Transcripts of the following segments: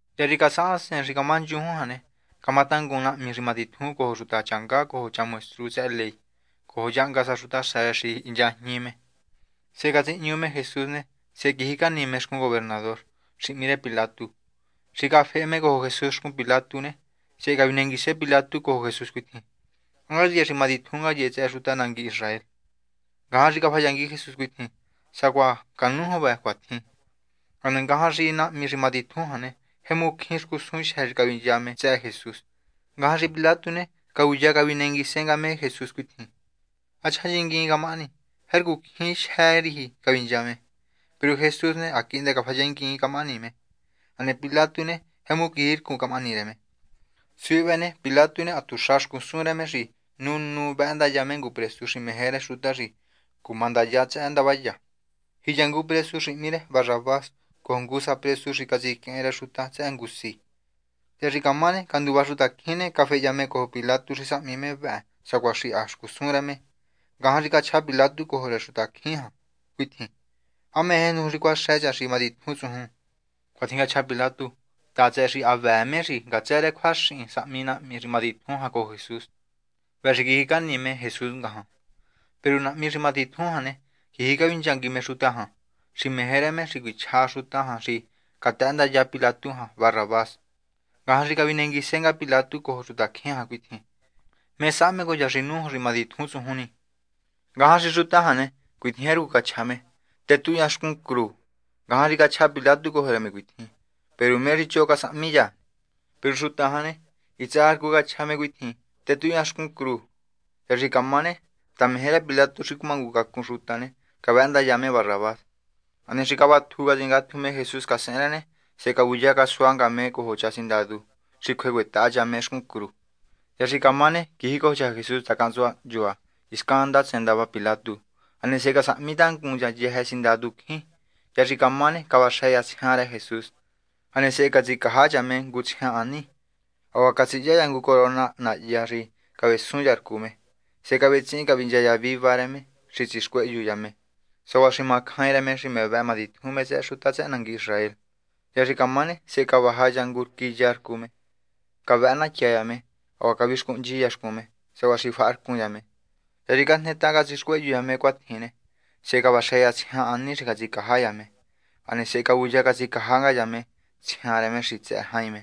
Hya xi casahasen xi camá nchujun jan ne, camatangun nga nahmi xi matitjun cojo xuta changá cojo cha maestru tsëhë ley cojo yahnga sa xutaxa rë xi hinchajñi me. Sehe catsihñu me Jesús ne, sehe quijicani me xcun gobernador xi hmí rë Pilatu. Xi cafehe me cojo Jesús xcun Pilatu ne, sehe cavinenguise Pilatu cojo Jesús cuitjin: ―¿Há ngaye xi matitjun ngaye tsëhë xuta nangui Israel? Ngajan xi cafayangui Jesús cuitjin: ―Cuatjin sacuaha canújun vë. Hane ngajan xi nahmi xi matitjun jan ne, jemu cjín xcusun jyë́ xi cavincha me tsëhë Jesús. Ngajan xi Pilatu ne, cavuya cavinenguise nga me Jesús cuitjin: ―¿Há chjayinnguiin camahani? Jercu cjín jyë́ riji cavincha me. Peru Jesús ne, ha quihndë cafayinnguiin camahani me. Hane Pilatu ne, jemu quijircun camahani rë me. Suhi vëhë ne, Pilatu ne, ha tuxa xcusun rë me xi nu nu ni vëhëndaya me ngu presu xi meje rë xuta xi cumandaya. Ndavaya ne, jiya ngu presu xi hmí rë Barrabás cojo ngujo sa presu xi catsiquehen rë xuta tsëhë ngu si. Hya xi camá ne, canduva xutacjín ne, cafehya me cojo Pilatu xi sahmi me vëhë sacuatjin xi ha xcusun rë me. Ngajan xi cachja Pilatu cojo rë xuta jan cuitjin: ―¿Há meje nuju xi cuáxë cha xi matitjun tsujun? Cuatjin cachja Pilatu ta tsëhë xi ha vëë me xi ngatsë rë cjuaxin sahmi nahmi xi matitjun jan cojo Jesús, vëhë xi quijicani me Jesús ngajan. Peru nahmi xi matitjun jan ne, quiji cavinchangui me xutacjín jan xi meje rë me xi cuichja xuta jan xi catëhëndaya Pilatu Barrabás. Ngajan xi cavinenguise nga Pilatu cojo xutacjín jan cuitjin: ―¿Mé sahme cojo cha xi nújun xi matitjun tsujun ni? Ngajan xi xuta jan ne, cuitjin jercu cachja me: ―Tetuhun cha xcun cru. Ngajan xi cachja Pilatu cojo rë me cuitjin: ―Peru ¿mé xi choho casahmi cha? Peru xuta jan ne, hitsë sa rcu cachja me cuitjin: ―Tetuhun cha xcun cru. Hya xi camá ne, ta meje rë Pilatu xi cumangucacun xuta ne, cavëhëndaya me Barrabás. Hane xi cavatju catsingatju me Jesús casehen rë ne, sehe cavuya casua nga me cojo cha sindadu xi cjue cuetaha cha me xcun cru. Hya xi camá ne, quijicojo cha Jesús taha cahntsua hnchua hiscan ndatsen ndava Pilatu. Hane sehe casahmi tangun sa cha yëjë sindadu cjín. Hya xi camá ne, cavaxë cha tsjian rë Jesús, hane sehe catsicaja cha me ngu tsjian hani. Hacuaha catsihya cha ngu corona nahyá xi cavesun cha rcu me. Sehe cavetsihin cavincha cha viva rë me xi tsixcuehyu cha me, sacuaha xi macjain rë me xi me vëhë matitjun me tsëhë xuta tsëhë nangui Israel. Hya xi camá ne, sehe cavaja cha ngu rquí ya rcu me. Cavëhë natya cha me. Hacuaha cavixcuhnchi cha xcun me, sacuaha xi faharcun cha me. Hya xi cajnetaha catsixcuehyu cha me cuatjin ne, sehe cavaxë cha tsjian hani xi catsicaja cha me, hane sehe cavuya catsicaja nga cha me tsjian rë me xi tsëhë jain me.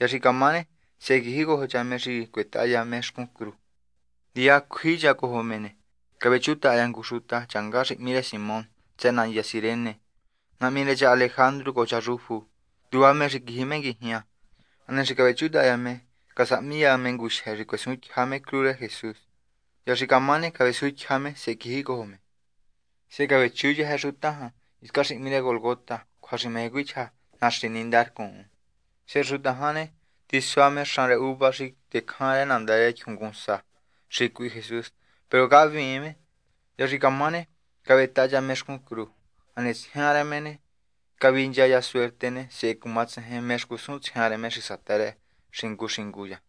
Hya xi camá ne, sehe quijicojo cha me xi cuetaha cha me xcun cru. Ndiya cjui cha cojo me ne, cavechutaha cha ngu xuta changá xi hmí rë Simón tsëhë nandya Cirene, nahmi rë cha Alejandru cojo cha Rufu. Nduva me xi quiji me nguijña. Hane xi cavechutaha cha me, casahmi cha me ngujyë xi cuesuntyja me cru rë Jesús. Hya xi camá ne, cavesuntyja me, sehe quiji me cojo. Sehe cavechu yëjë xuta jan hiscan xi hmí rë Gólgota, cjua xi meje cuichja Naxi Nínda Rcuun. Sehe xuta jan ne, tisua me xan rë uva xi tecjan rë nandá rë tyjungunsa xi cuihi Jesús, peru cahviin me. Hya xi camá ne, cavetaha cha me xcun cru. Hane tsjian rë me ne, cavincha rë cha ngu suerte ne, sehe cumatsejen mé xcusun tsjian rë me xi satë rë xingu xingu cha.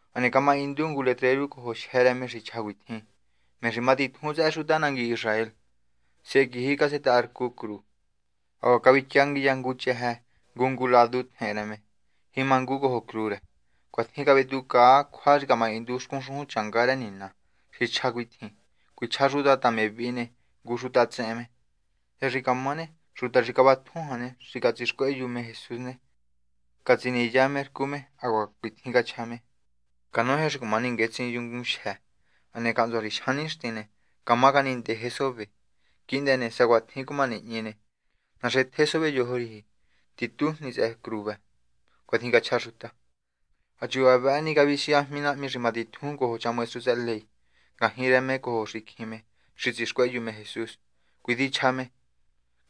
Hane camahindu ngu letreru cojo jyë́ rë me xi chja cuitjin: “Me xi Matitjun tsëhë Xuta nangui Israel.” Sehe quiji casetaharcu cru. Hacuaha cavityangui cha ngu chëjë ngu ngu ladu rë tjehen rë me, jimangu cojo cru rë. Cuatjin cavetjucaa cjua xi camahindu xcun xujun rë Nina xi chja cuitjin: “Cuichja xuta ta me vihi ne, ngu xuta tsehen me.” Hya xi camá ne, xuta xi cavatju jan ne, xi catsixcuehyu me Jesús ne, catsiniya me rcu me, hacuaha cuitjin cachja me: ―Canoje xi cuma ninguetsin yungun xi matitjun, hane cahntsua xi jyan nixtin ne, cama nga canindeje sove. Quihndë ne, sá cuatjin cuma nihñi ne, naxetje sove yojo riji, titujni tsëhë cru vë. ―Cuatjin cachja xuta. Ha chuva vëhë ni, cavisiajmi nahmi xi matitjun cojo cha maestru tsëhë ley ne, ngajñi rë me cojo xicjin me xi tsixcuehyu me Jesús. Cuitjin chja me: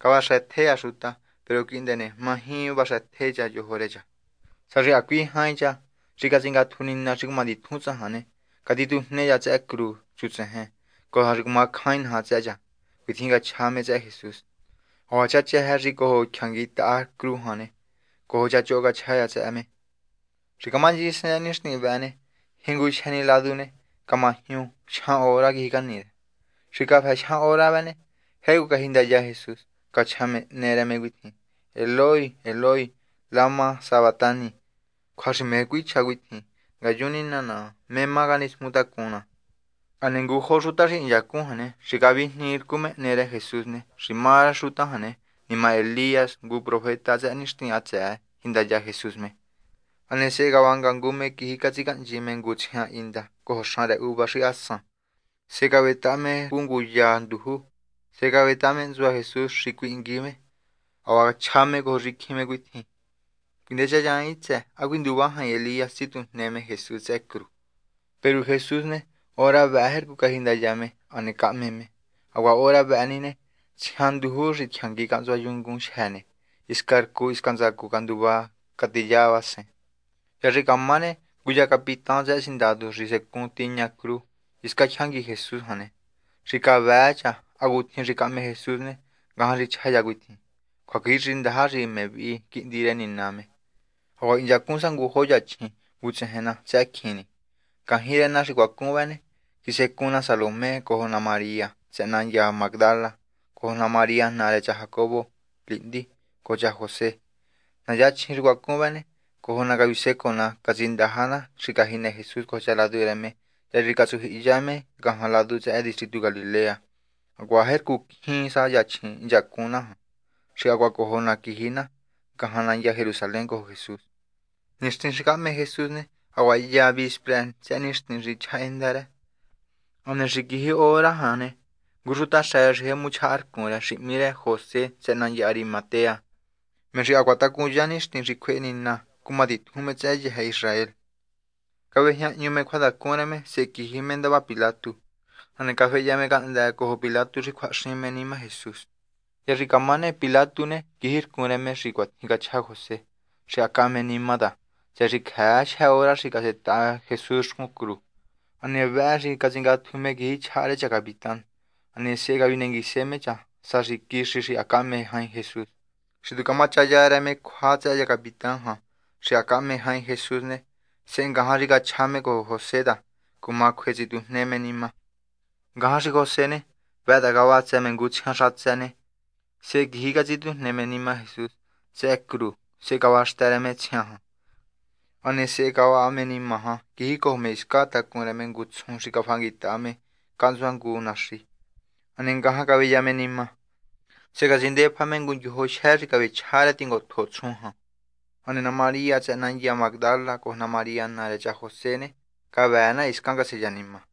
―Cavaxëtje cha xuta, peru quihndë ne, maji vaxëtje cha yojo rë cha. Sá xi hacui jain cha xi catsingatju Nina xi cumatitjun tsajan ne, catitujne cha tsëhë cru chutsejen, cojo sa xi cumacjain naja tsëhë cha. ―Cuatjin cachja me tsëhë Jesús. Hacuaha cha chëjë xi cojo xtyangui taha cru jan ne, cojo cha choho cachja cha tsëhë me. Xi camanchisen tsëhë nixtin vëhë ne, jingujyë ni ladu vëhë ne, camajñu. Jyan hora quijicani rë. Xi cafë jyan hora vëhë ne, jercu cajindaya Jesús, cachja me hne rë me cuitjin: ―Eloí. Eloí, ¿lama sabactani? ―cjua xi meje cuichja cuitjin: Ngayun, Nina naha, ¿mé má canismutacun ná? Hane ngujo xuta xi hinchacun jan ne, xi cavijniinrcu me hne rë Jesús ne, xi má rë xuta jan ne, nima Elías, ngu profeta tsëhë nixtin hatsëë, jindaya Jesús me. Hane sehe cavanga ngu me quiji catsicahnchi me ngu tsjian hinda cojo xan rë uva xi ha san. Sehe cavetaha me rcu ngu ya nduju, sehe cavetaha me hntsua Jesús xi cuihingui me. Hacuaha chja me cojo xicjin me cuitjin: ―Cuinechanyan hitsë ne, ¿há cuinduva jain Elías tsitujne me Jesús tsëhë cru? Peru Jesús ne, hora vëhë jercu cajindaya me, hane cahme me. Hacuaha hora vëhë ni ne, tsjian nduju xi tyjangui cahntsua yungun xi matitjun ne, hisca rcu hiscan ntsacu canduva catiyavasen. Hya xi camá ne, ngu cha capitán tsëhë sindadu xi secun tiña cru hisca tyjangui Jesús jan ne, xi cavëë cha hacutjin xi cahme Jesús ne, ngajan xi chja cha cuitjin: ―Cjuaquixindaja xi me vihi xi Quihndi rë Nina me. Hacuaha hinchacun sa ngujo yachjin, vutsejen na tsëhë cjin ni. Ngajñi rë na xi cuacun vëhë ne, quisecun na Salomé cojo na María tsëhë nandya Mágdala cojo na María naa rë cha Jacobo lihndi cojo cha José. Na yachjin xi cuacun vë ne, cojo na cavisecoo na catsindaja na xi cajinë Jesús cojo cha ladu rë me, hya xi catsujyihiya me ngajan ladu tsëhë distritu Galilea. Hacuaha jercu cjín sa yachjin hinchacun na jan xi hacuaha cojo na quiji na ngajan nandya Jerusalén cojo Jesús. Nixtin xi cahme Jesús ne, hacuaha hya vispra tsëhë nixtin xi chjahájenda rë. Hane xi quiji hora jan ne, ngu xutaxa rë xi tjemu chjahanrcun rë, xi hmí rë José tsëhë nandya Arimatea, me xi hacuaha tacunya nixtin xi cjuehe Nina cuma titjun me tsëhë yëjë Israel, cavejñahñu me cjuatacun rë me sehe quiji me ndava Pilatu. Hane cafehya me cahndë́ cojo Pilatu xi cjuahaxin me nima Jesús. Hya xi camá ne, Pilatu ne, quijircun rë me xi cuatjin cachja José xi ha cahme nima ta, tsëhë xi cjëë jyë hora xi casetaha Jesús xcun cru. Hane vëhë xi catsingatju me quiji chjaha rë cha capitán. Hane sehe cavinenguise me cha sá xi quixi xi ha cahme jain Jesús. Xi tu camachaya rë me cjua tsëhë cha capitán jan xi ha cahme jain Jesús ne, sehe ngajan xi cachja me cojo José ta cuma cjue tsitjujne me nima. Ngajan xi José ne, vëhë ta cavatsë me ngu tsjiantë xatsë ne, sehe quiji catsitujne me nima Jesús tsëhë cru, sehe cavaxtë rë me tsjian jan. Hane sehe cavaha me nima quijicojo me hiscan tacun rë me ngu tsjun xi cafahanguitaha me cahntsua ngu naxi. Hane ngajan caveya me nima. Sehe catsindefajne me ngu ndyojo jyë xi cavechja rë tingotjo tsjun jan. Hane na María tsëhë nandya Mágdala cojo na María naa rë cha José ne, cavëë na hiscan caseya nima.